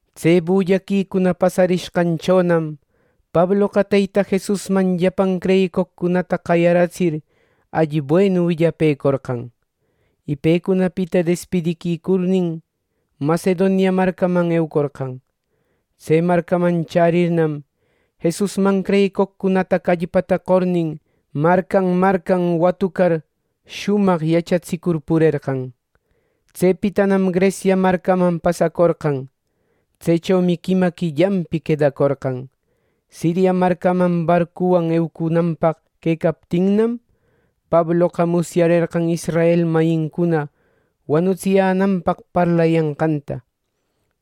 Tse bullaquicuna pasacurishqanchonam Pabloqa Teyta Jesusman llapan creyicoqcunata qayaratsir alli buenu willapëcorqan, y pecunapita despidiquicurnin, Macedonia marcaman eucorqan. Tse marcaman chärirnam, Jesusman creyicoqcunata callpata qornin marcan marcan watucar shumaq yachatsicur purerqan. Tsepitanam Grecia marcaman pasacorqan. Tsechomi quima quillanpi quedacorqan. Siria marcaman barcuwan eucunanpaq quecaptinnam, Pabloqa musyarerqan israel mayincuna wanutsiyänanpaq parlayanqanta.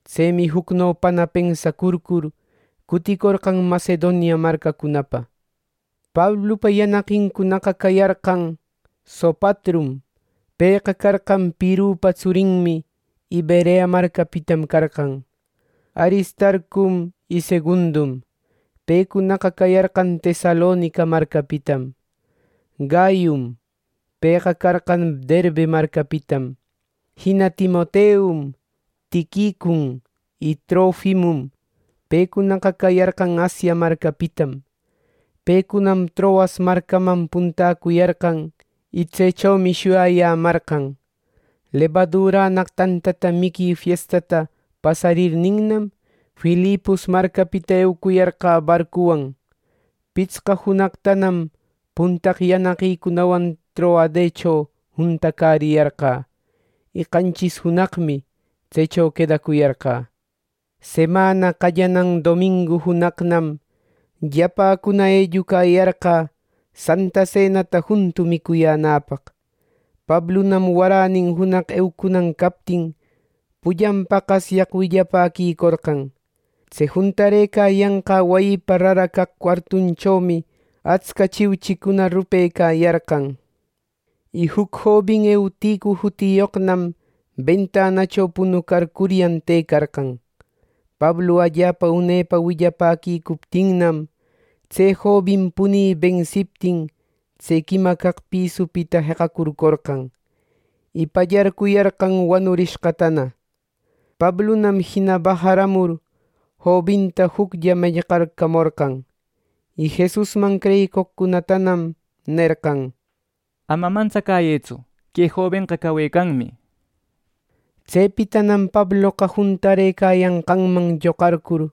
Tsemi jucnopana pensacurcur cuticorqan Macedonia marcacunapa. Pablupa yanaqincunaqa cayarqan: Sopatrum (pëqa carqan Pirrupa tsurinmi y Berea marcapitam carqan), Aristarcum y Segundum (pecunaqa cayarqan Tesalonica marcapitam), Gayum (pëqa carqan Derbe marcapitam), jina Timoteum, Tiquicun y Trofimum (pecunaqa cayarqan Asia marcapitam.) Pecunam Troas marcaman puntäcuyarqan y tsechomi shuyayämarqan. Lebadurannaq tanta miqui fiestata pasarirninnam, Filipos marcapita eucuyarqä barcuwan. Pitsqa junaqtanam puntaq yanaqïcunawan Troadecho juntacäriyarqä, y qanchis junaqmi tsecho quedacuyarqä. Semana qallanan domingu junaqnam llapäcuna ellucayarqä santa senata juntu micuyänäpaq. Pablunam waränin junaq eucunan captin pullan paqasyaq willapäquicorqan. Tse juntarëcayanqä wayipa rara caq cuartunchomi atsca chiuchicuna rupecayarqan. Y juc jobin Euticu jutiyoqnam bentanacho punucarcuyan tëcarqan. Pablu allapa une willapäquicuptinnam, tse jobin punï bensiptin tse quima caq pisupita jeqacurcorqan; y pallarcuyarqan wanurishqatana. Pablunam jina bajaramur jobinta juclla mellqarcamorqan. Y Jesusman creyicoqcunatanam nerqan: —Ama mantsacäyëtsu. Que jobenqa cawecanmi —nishpa. Tsepitanam Pabloqa juntarëcayanqanman lloqarcur,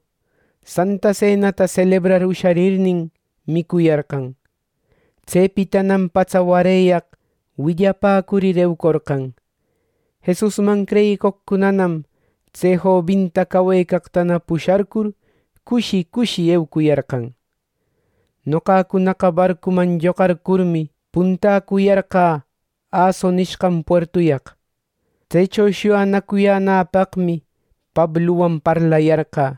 santa senata selebrar usharirnin, micuyarqan. Tsepitanam patsa wareyaq willapäcurir, eucorqan. Jesusman creyicoqcunanam tse jobinta cawecaqtana pusharcur, cushi cushi eucuyarqan. Noqacunaqa barcuman lloqarcurmi, puntäcuyarqä Aso nishqan puertuyaq, tsecho shuyanacuyänäpaqmi Pabluwan parlayarqä.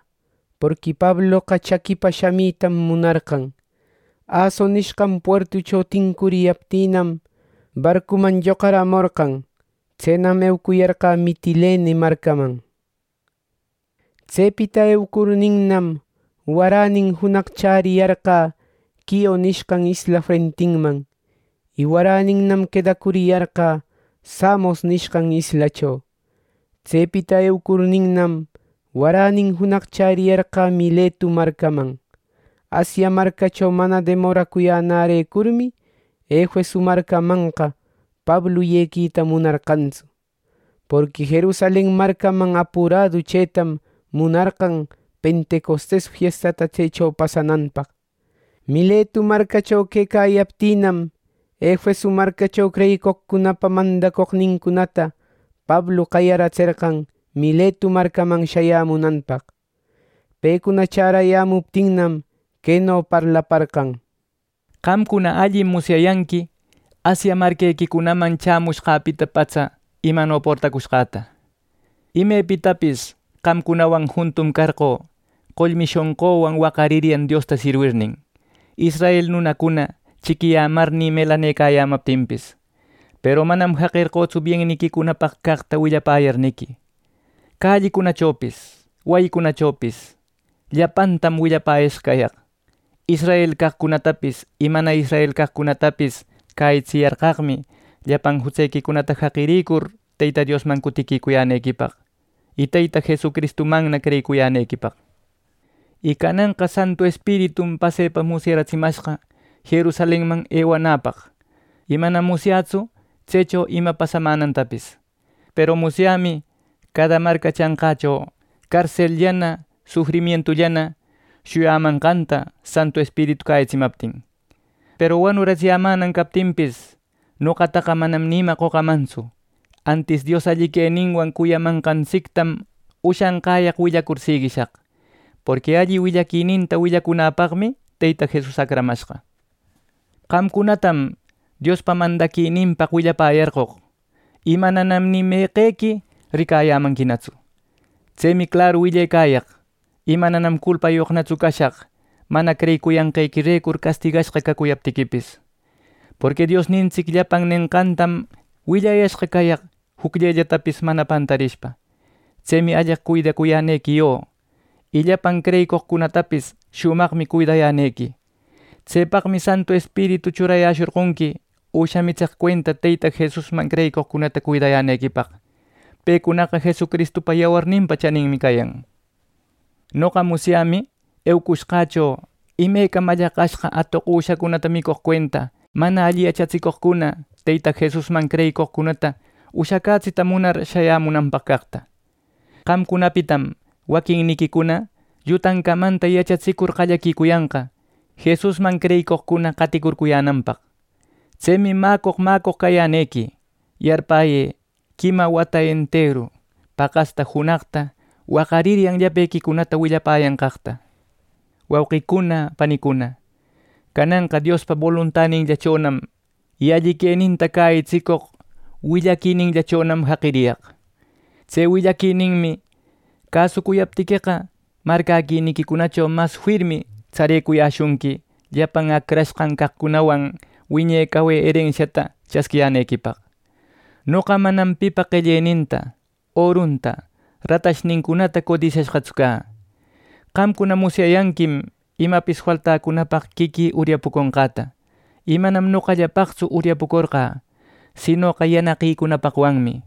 Porqui Pabloqa chaquipa shamitam munarqan. Aso nishqan puertucho tincuriyaptïnam, barcuman lloqaramorqan, tsenam ewacuyarqä Mitilene marcaman. Tsepita eucurninnam, waränin junaq chäriyarqä Quio nishqan isla frentinman. Y waräninnam quedacuriyarqä Samos nishqan islacho. Tsepita eucurninnam, waränin junaq chäriyarqä Miletu marcaman. Asia marcacho mana demoracuyänärecurmi Efeso marcamanqa Pablu yequita munarqantsu, porqui Jerusalen marcaman apuradu chëtam munarqan pentecostes fiestata tsecho pasananpaq. Miletu marcacho quecayaptïnam, Efeso marcacho creyicoqcunapa mandacoqnincunata Pablu qayaratserqan Miletu marcaman shayämunanpaq. Pecuna chärayämuptinnam, queno parlaparqan: “Qamcuna allim musyayanqui Asia marquequicunaman chämushqäpita patsa imano portacushqäta. Imepitapis qamcunawan juntum carqö qollmi shonquwan waqariryan Diosta sirwirnin, israel nunacuna chiquiyämarnï melanecayämaptinpis. Peru manam jaqerqötsu bienniquicunapaq caqta willapäyarniqui, callicunachopis wayicunachopis llapantam willapäyashqa cayaq. Israel caqcunatapis y mana israel caqcunatapis cäyitsiyarqaqmi llapan jutsequicunata jaqirïcur Teyta Diosman cutiquicuyänequipaq y Teyta Jesucristumanna creyicuyänequipaq. Y cananqa Santu Espiritum pasepa musyaratsimashqa Jerusalenman ewananäpaq. Y manam musyätsu tsecho ima pasamänantapis. Peru musyämi cada marca chanqächo carselllanä sufrimientullana shuyamanqanta Santu Espiritu cäyitsimaptin. Peru wanuratsiyämänan captinpis, noqataqa manam ni ima qocamantsu, antis Dios alli queninwan cuyamanqantsictam ushanqäyaq willacur siguishaq, porqui alli willaquininta willacunanpaqmi Teyta Jesus acramashqa. “Qamcunatam Diospa mandaquininpaq willapäyarqoq y mananam ni meqequi ricayämanquinatsu. Tsemi claru willecayaq, y mananam culpayoqnatsu cashaq mana creyicuyanqanrecur castigashqa cacuyaptiquipis. Porqui Diosnintsic llapan nenqantam willayashqa cayaq jucllellatapis mana pantarishpa. Tsemi alleq cuidacuyänequi yo, y llapan creyicoqcunatapis shumaqmi cuidayänequi. Tsepaqmi Santu Espiritu churayäshorqonqui üsha mitseq cuenta Teyta Jesusman creyicoqcunata cuidayänequipaq. Pecunaqa Jesucristupa yawarninpa chaninmi cayan. Noqa musyämi eucushqächo imeca mallaqashqa atoq üshacunata micoq cuenta, mana alli yachatiscoqcuna Teyta Jesusman creyicoqcunata ushacätsita munar shayämunanpaq caqta. Qamcunapitam waquinniquicuna llutan camanta yachatsicur qallaquicuyanqa Jesusman creyicoqcuna qaticurcuyänanpaq. Tsemi mäcoq mäcoq cayänequi; yarpäyë quima wata enteru paqasta junaqta waqariryan llapequicunata willapäyanqaqta. “Wauqicuna, panicuna, cananqa Diospa boluntaninllachonam y alli queninta cäyitsicoq willaquininllachonam jaqiriyaq. Tse willaquininmi cäsucuyaptiqueqa, marcäquiniquicunacho mas firmi tsarecuyäshunqui llapan acrashqan caqcunawan wiñe cawe erensianta chasquiyänequipaq. Noqa manam pipa qelleninta, orunta, ratashnincunata codisyashqatsu cä. Qamcuna musyayanquim imapis faltäcunapaq quiquï uryapuconqäta; y ˻manam noqallapaqtsu uryapucorqa sinoqa˼ yanaqïcunapaqwanmi.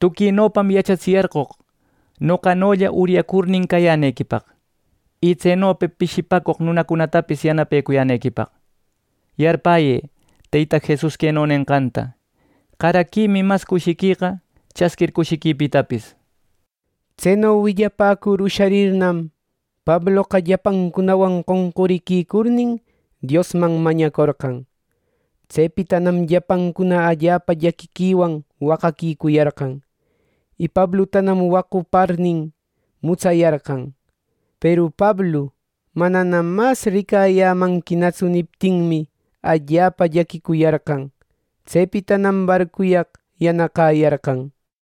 Tuquinopam yachatsiyarqoq noqanolla uryacurnin cayänequipaq, y tsenopa pishipäcoq nunacunatapis yanapayänequipaq. Yarpäyë Teyta Jesus queno nenqanta: ‘Qaraquimi mas cushiqueqa chasquir cushiquipitapis’” nir. Tseno willapäcur usharirnam, Pabloqa llapancunawan qonquriquicurnin Diosman mañacorqan. Tsepitanam llapancuna allapa llaquiquiwan waqaquicuyarqan, y Pablutanam waquparnin mutsayarqan. Peru Pablu “Mananam mas ricayämanquinatsu” niptinmi, allapa llaquicuyarqan. Tsepitanam barcuyaq yanaqäyarqan.